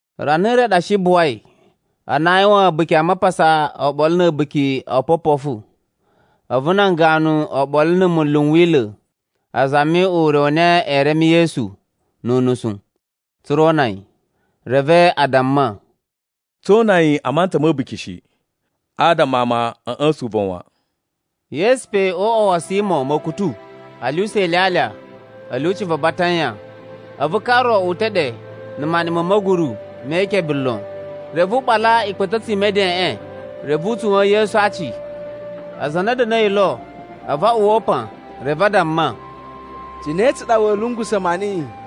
Rana re ɗa shi buwai, ana aa yuwan A̱buki a Mapasa oɓolo na̱ A̱buki o Opopofu. A̱vu nan ganu oɓolo na̱ munlu n Wila̱ a zami ure u na ee reme Yesu nu unusu, tsa̱ra̱ o una yi. Reve a damma, “Tsoo una niyi a mantsa ma̱ a̱buki shi, adama ama a̱ ꞌya̱sa̱n uvon wan.” Yesu pe o uꞌwa wa̱ Simo Ma̱kutu a lyuwusa ilyalya a̱ lyuci va Batanya, a̱vu ka ro uta̱ ɗe na̱ maniꞌin ma̱ ma̱guru me ikebe lon. Reve u ɓala ikpa̱ta̱tsu i medeꞌen, reve u tsuwa̱n Yesu a aaci. Aza a na a̱ da̱na̱i lo, a̱vu a uwwa upan. Reve a damma, “Cine tsa ɗa wa̱a̱ lungusa̱ maniꞌiꞌin?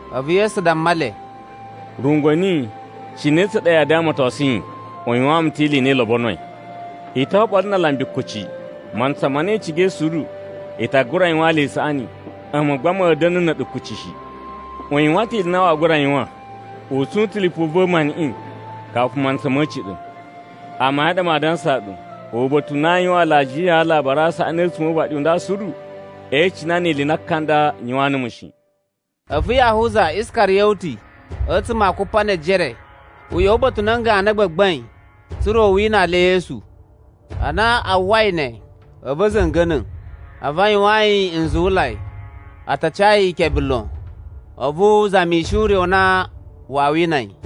A̱vu Yesu damma le, “Rungwa̱ niyi, cine tsa ɗa yaa damatosun yi? U yuwaan mu ta̱ ili i na i lobonoi. I to oɓolo na alambi kuci, mantsa ma na i cigai suru, i ta gura yuwaan le ili i saꞌani. A̱mu gba ma̱a̱ da̱na̱ na̱ ɗu kuci shi. U yuwan ta̱ ili i na waa gura yuwan, u tsun ta̱ lipu va̱ maniꞌin kafu mantsa ma̱ a̱ciɗa̱. Amayun a ɗa maa dansaa ɗu, uba̱ta̱ u na aa yuwan alajiya a Alabari a Saꞌani a̱tsuma̱ o uvaɗi u nda suru, ee icina ili i na ka nda u yuwaan numu shi.” A̱vu Yahuza Iskariyoti, a̱tsuma̱ a Kupanejere, u ꞌya̱wa̱ uba̱ta̱ u nan ganu a gbagbain, tsa̱ra̱ u winaa le Yesu. Ana a uwwai ne, a̱vu a̱ za̱nga̱na̱. A̱vu a yuwaan yi nzuwulai, a ta ca yi ikebe lon. A̱vu u zamishi ure u na waa wina yi.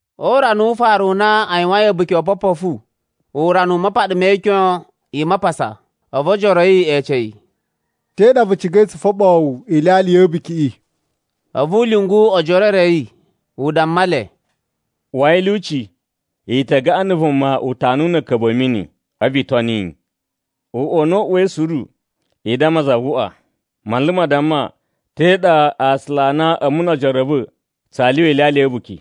O urana wu ufaru u na a yuwain A̱buki o Opopofu, urana u mapaɗa me ikyon i Mapasa, a̱vu ojoro a̱ yi e ece yi, “Te ɗa vu cigai tsu foɓoo wu ilyalya ya̱ a̱bukiꞌi?” A̱vu u lyungu ojoro e re a̱ yi, u damma le, “Uwai a̱ lyuci, i ta gaꞌan na̱ vuma utanuwu na̱ a̱a̱ka̱bu a̱ mini, a̱vu i toni yi. Uꞌwa u na u uwai suru, i damma za vu uꞌwaꞌa, ‘Manlu ma damma, te ɗa aasula a na a̱mu no ojoro a̱ va̱ tsaa lyuwa ilyalya ya̱ a̱buki?’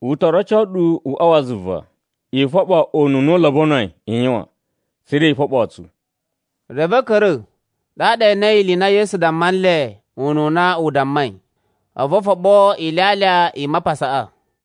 U to roco ɗu uꞌwa wa zuva, i foɓo ununa u lobonoi i yuwan, tsa̱ra̱ i foɓoo tsu.” Reve a̱ ka̱ra̱, ɗaɗa e enei ili i na Yesu damma nle ununa u dammai. A̱vu o foɓo ilyalya i Mapasaꞌa.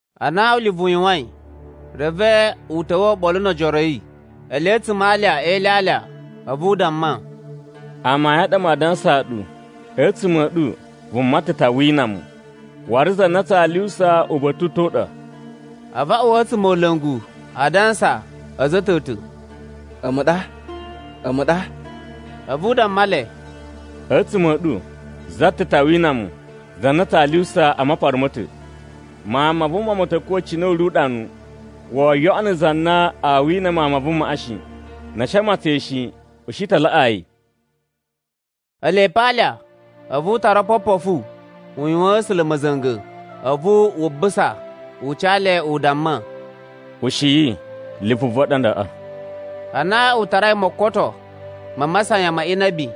Ana ulivu u yuwain, reve u ta̱wa̱ oɓolo no ojoro a̱ yi. Ele a̱tsuma̱ a alya e ilyalya, a̱vu u damma, “Amayun a ɗa maa dansaa ɗu, a̱tsuma̱ a̱ ɗu vuma ta̱ ta wina mu, waru za na tsaa lyuwusa uba̱ta̱ u ta̱ u ɗa.” A̱vu a uwa a̱tsumola̱ngu a dansa a̱za̱ ta̱ ta̱, “A̱mu ɗa, a̱mu ɗa?” A̱vu u damma le, “A̱tsuma̱ a̱ ɗu za ta̱ ɗu ta wina mu, za na tsaa lyuwusa a mapara ma̱ ta̱. Mawun ma Vuma ma̱ ta̱ kuwa̱ cine u ri uɗanu. Woo yoꞌono za na aa wina Mawun ma Vumaꞌa shi. Na̱ a̱ shi a matsan yi shi, u shi ta laꞌaa yi.” Ele pe a alya, a̱vu u tara opopofu u yuwaan A̱sula̱ ma̱za̱nga̱. A̱vu wu busa u ca le u damma, “Ushiyi, lipu va̱ ɗa ndaꞌa.” Ana u tarai mokoto ma masayan ma inabi,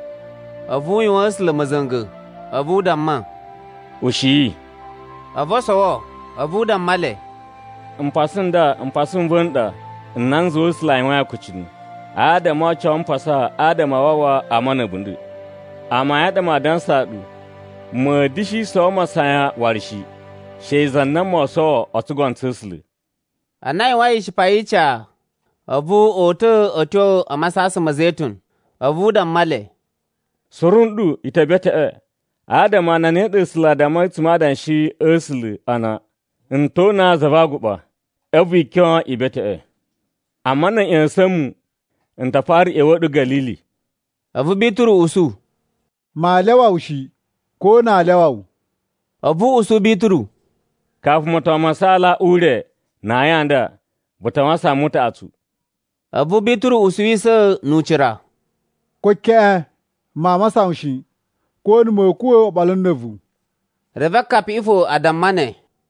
a̱vu u yuwaan A̱sula̱ ma̱za̱nga̱. A̱vu u damma, “Ushiyi,” a̱vu o sowo. A̱vu u damma le, “Mpasa nda mpasa n va̱ n ɗa na n zuwai A̱sula̱ a yuwain akucunu, adama oo oco mpasa adama a wawa ama na̱ a̱bunda̱. Amayun a ɗa maa dansaa ɗu, ma̱a̱ da̱shi sowo masayan waru shi, she za na moo sowo o tsugono tsa̱ A̱sula̱.” Ana a yuwain ishipa yi ica, a̱vu o uta̱ a̱ tyo a Masasan ma̱ Zetun. A̱vu u damma le, “Suru nɗu i ta̱ beteꞌwe adama a na ne ɗa A̱sula̱ a dammai a̱tsuma̱ a Adanshi a̱ A̱sula̱ ana: ‘N to una za va aguɓa, a̱vu ikyon i beteꞌwe.’ “Amma na̱ a̱ ꞌya̱sa̱n mu, n ta fara ꞌya̱wa̱a̱ ɗu Ga̱lili.” A̱vu Bituru usu, “Maa lyawa wu shi, ko na aa lyawa wu.” A̱vu u usu Bituru, “Kafu moton ma saala ure na ayin a nda, vu ta wasan mu utaꞌatsu.” A̱vu Bituru usuwisa̱ nu ucira, “Ko keꞌen maa wasan wu shi, ko na̱ ma̱a̱ kuwa̱ oɓolo na̱ a̱vu.” Reve akapiꞌi fo a damma ne.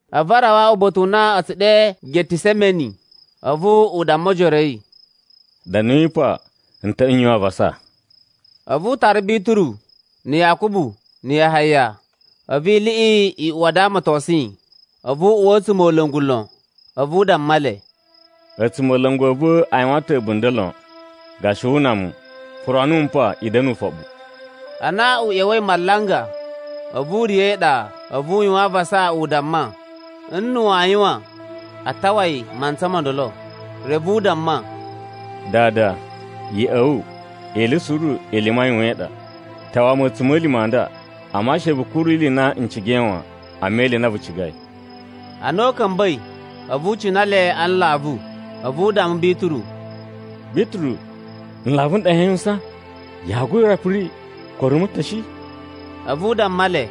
A̱vu a rawa uba̱ta̱ u na a̱ tsu ɗe Getisemeni. A̱vu u damma ojoro a̱ yi, “Da̱nuyi pa n ta yuwan avasa.” A̱vu u tara Bituru na̱ Yakubu na̱ Yahaya. A̱vu iliꞌi i uwa a damatosun yi, a̱vu u uwa a̱tsumola̱ngu lon. A̱vu u damma le, “A̱tsumola̱ngu a̱ va̱ a yuwan ta̱ a̱bunda̱ lon, gashi wu una mu. Puro numu pa i da̱na̱ ufoɓu.” Ana u ꞌya̱wa̱i malanga, a̱vu u riya̱ e iɗa, a̱vu u yuwan avasa u damma, n na̱ waa yuwan, a tawa yi mantsa mo ndolo. Reve u damma, “Dada, ya̱ꞌa̱ wu ili suru ili i mayuwaan ma ɗa. Tawa mu a̱tsuma̱lima̱ a nda. Amma she vu kuru ili i na n cigai wan, amma ili i na vu cigai.” Ana u ka̱mba̱i, a̱vu u cina le a nlavu. A̱vu u damma Bituru, “Bituru, nlavu n ɗa yaa yuwusan, yaa gura piri ko rumu ta̱ shi?” A̱vu u damma le,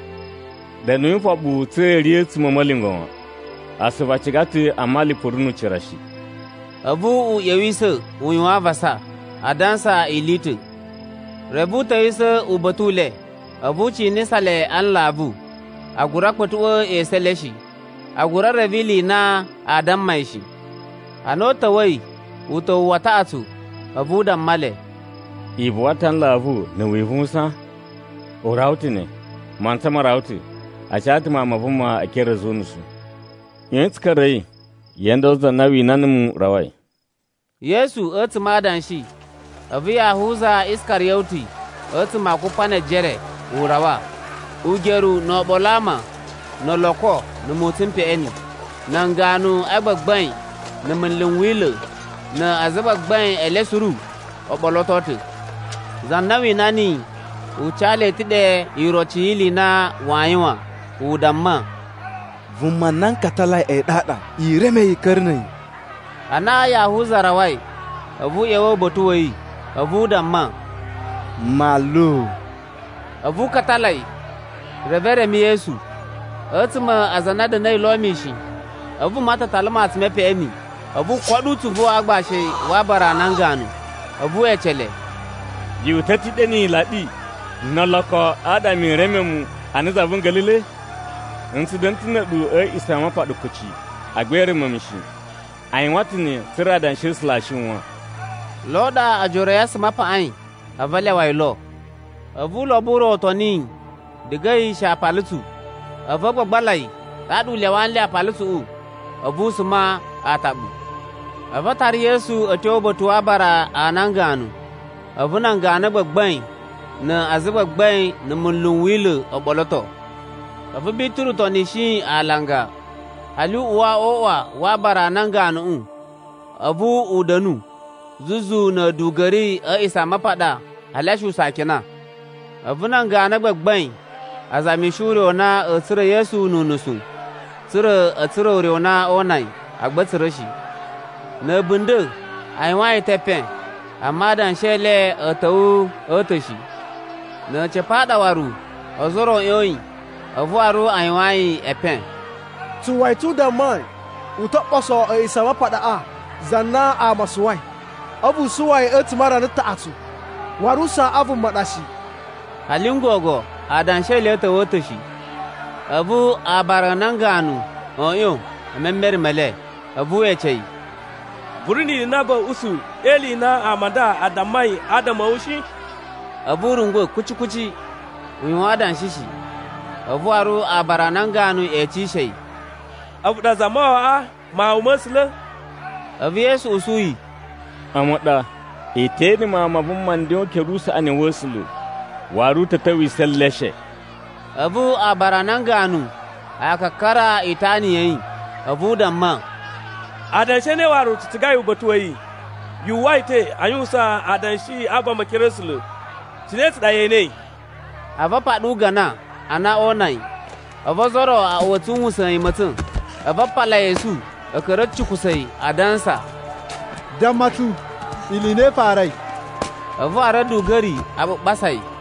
“Da̱nuyi ufoɓu tsa̱ra̱ i riya̱ a̱tsuma̱ a̱ ma̱lyungwa̱ wan. Asuvu a ciga ta̱ amma lipu ri nu ucira shi.” A̱vu u ꞌya̱wisa̱ u yuwan avasa, a dansa ili i ta̱. Reve u ta̱wisa̱ uba̱ta̱ u le. A̱vu u cinisa le a nlavu, a gura kpa̱tuꞌwa̱ esu e le shi. A gura reve ili i na aa damma yi shi. Ana u ta̱wa̱i uta̱wu wa taꞌatsu, a̱vu u damma le, “I buwa ta̱ a nlavu na̱ wivuwusan? U rawa ta̱ ne, mantsa ma rawa ta̱. A ca ta̱ Mawun ma Vuma e ekere a̱ a̱za̱ o unusu. ꞌYoyin tsu ka̱ra̱i. Ye ene ndolo za na wina numu rawai.” Yesu a̱tsuma̱ a adanshi, a̱vu Yahuza Iskariyoti a̱tsuma̱ a Kupanejere, u rawa, ugeru no oɓolo a ama no oloko nu mutsun mu peꞌeni. Nan ganu a gbagbain, na̱ munlu n Wila̱, na azagbagbain e le suru o ɓoloto ta̱. Za na wina niyi u ca le ta̱ ɗe iroci yi ili i na waa yuwan, u damma, “Vuma na n katalai a̱yi ɗaɗa. I reme yi i ka̱ra̱ na̱ a̱yi.” Ana Yahuza rawai, a̱vu u ꞌya̱wa̱ uba̱ta̱ wa̱ yi. A̱vu u damma, “Manlu.” A̱vu u katala yi. Reve e reme Yesu. A̱tsuma̱ a aza a na a̱ da̱na̱i lo mishin, a̱vu vuma ta̱ tala matsun me peꞌeni u koɗo utsuvu wa aagbashi wa aabara a nan ganu. A̱vu we ece le, “Yu uta̱ ta̱ ɗe ni ilaɗi no oloko adama i reme mu ana za vu nga̱la̱la̱i? N tsu da̱na̱ ta̱ na̱ a̱ɗu a̱ A̱a̱ꞌisamapaɗa kuci, agba i reme mu shi. A yuwan ta̱ ne, tsa̱ra̱ Adanshi a̱ A̱sula̱ aa shiwan.” Lo ɗa ojoro a̱ yi a suma a paꞌain, a̱vu a lyawa yi lo. A̱vu ulobo u ro u toni yi diga a̱yi she aapalutsu. A̱vu a gbagbala yi. Ɗaɗa u lyawa nle aapalutsuꞌu, a̱vu u suma aataɓu. A̱vu a tara Yesu a̱ tyo uba̱ta̱ wa aabara a nan ganu, a̱vu nan ganu a gbagbain na azagbagbain na̱ munlu n Wila̱ o ɓoloto. A̱vu Bituru tonishi yi alanga, hali u uwa o uꞌwa wa aabara a nan ganuꞌu. A̱vu u da̱nu zuzu na̱ a̱duga̱ri a̱ A̱a̱ꞌisamapaɗa a lyasuwusa akina. A̱vu nan ganu a gbagbain a zamishi ure u na a̱a̱ tsura̱ Yesu nu unusu, tsa̱ra̱ a̱ tsura̱ ure u na oo una yi. Agba a̱ tsura̱ shi. Na̱ a̱bunda̱ a yuwaan yi ta̱ epen, amma adanshi e le a̱ ta̱wa̱ a̱ ta̱ shi. Na̱ a̱ca̱pa̱ a ɗa waru ozo o ro a̱ ꞌyoyin, a̱vu waru a yuwaan yi epen. “Tsu uwwa yi ta̱ u dammai u to ɓoso A̱a̱ꞌisamapaɗaꞌa za na ama a suwai, a̱vu u suwa yi a̱tsuma̱ a rana taꞌatsu, waru usaa u vuma u ɗa shi.” Hali n gogo adanshi e le a̱ ta̱wa̱ a̱ ta̱ shi. A̱vu aabara a nan ganu a̱ ꞌyon e memere me le. A̱vu we ece yi, “Vu ri ni ili i na va̱a̱ usu e ili i na ama a dammai adama a̱ wu shi?” A̱vu u rungwa̱ kuci kuci, u yuwan adanshi shi. A̱vu waru aabara a nan ganu e ecishe yi, “A̱vu ɗa Zamawawaꞌa, Mawun ma̱ A̱sula̱?” A̱vu Yesu usu yi, “A̱mu ɗa. I te ene Mawun ma Vuma nden o ukere usaꞌani wa̱ A̱sula̱, waru u ta̱ ta̱wisa̱ e eleshe.” A̱vu aabara a nan ganu a kakara itana ya̱ yi. A̱vu u damma “Adanshi a̱ ne waru tsu cigai uba̱ta̱ wa̱ yi? Yu uwwa yi ta̱ a yuwusan adanshi a vama e ekere a̱ A̱sula̱. Cine tsa ɗa ye enei?” A̱vu a paɗa ugana a na oo una yi. A̱vu ozo o ro a uwa a̱ tsuwusa̱n yi ma̱tsa̱n, a̱vu a pala yi esu a̱ ka̱ra̱ a̱ cikusa̱ yi a dansa, “Damma tsu ili i na i farai.” A̱vu waru a̱duga̱ri a ɓuɓasa yi.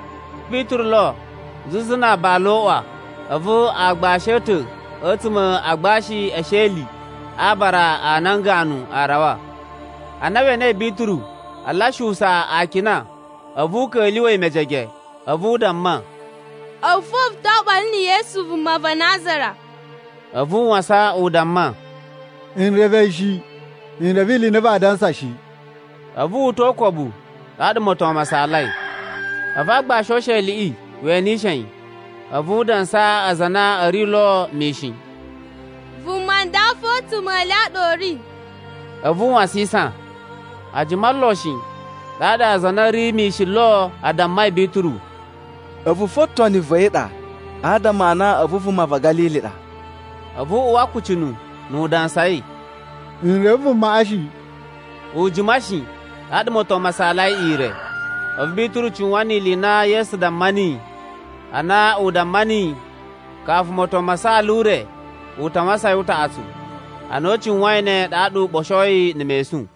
Bituru lo zuzu na aabala o uꞌwa, a̱vu aagbashi a̱ ta̱ a̱tsuma̱ a agbashi e esheli a aabara a nan ganu a rawa. Ana we enei Bituru a lyasuwusa akina, a̱vu u ka̱lyuwa̱ yi mejege. A̱vu u damma, “A̱vu fo vu to oɓolo na̱ Yesu vuma va Nazara.” A̱vu u wasan u damma, “N reve yi shi, n reve ili i na vaa dansa shi.” A̱vu wu uta̱ o ukobu, ɗaɗa moton ma saalai. A̱vu aagbashi o usheliꞌi we ene yi, a̱vu u dansaa aza a na a̱ ri lo mishin, “Vuma ndaꞌa fo a̱tsuma̱ e le a ɗa u ri.” A̱vu u wasisan. A jima lon shi, ɗaɗa aza a na a̱ ri mishin lo a dammai Bituru, “A̱vu fo toni va̱ yi ɗa adama a na a̱vu vuma va̱ Ga̱lili ɗa.” A̱vu u uwa akucunu, nu u dansai, “N reve vumaꞌa shi.” U jima shi, ɗaɗa moton ma saalai ire. A̱vu Bituru cuwan ni ili i na Yesu damma niyi ana u damma niyi, kafu moton ma saala ure, u ta wasan yi utaꞌatsu. Ana u cuwain ne, ɗaɗa u ɓoshoi na̱ mesun.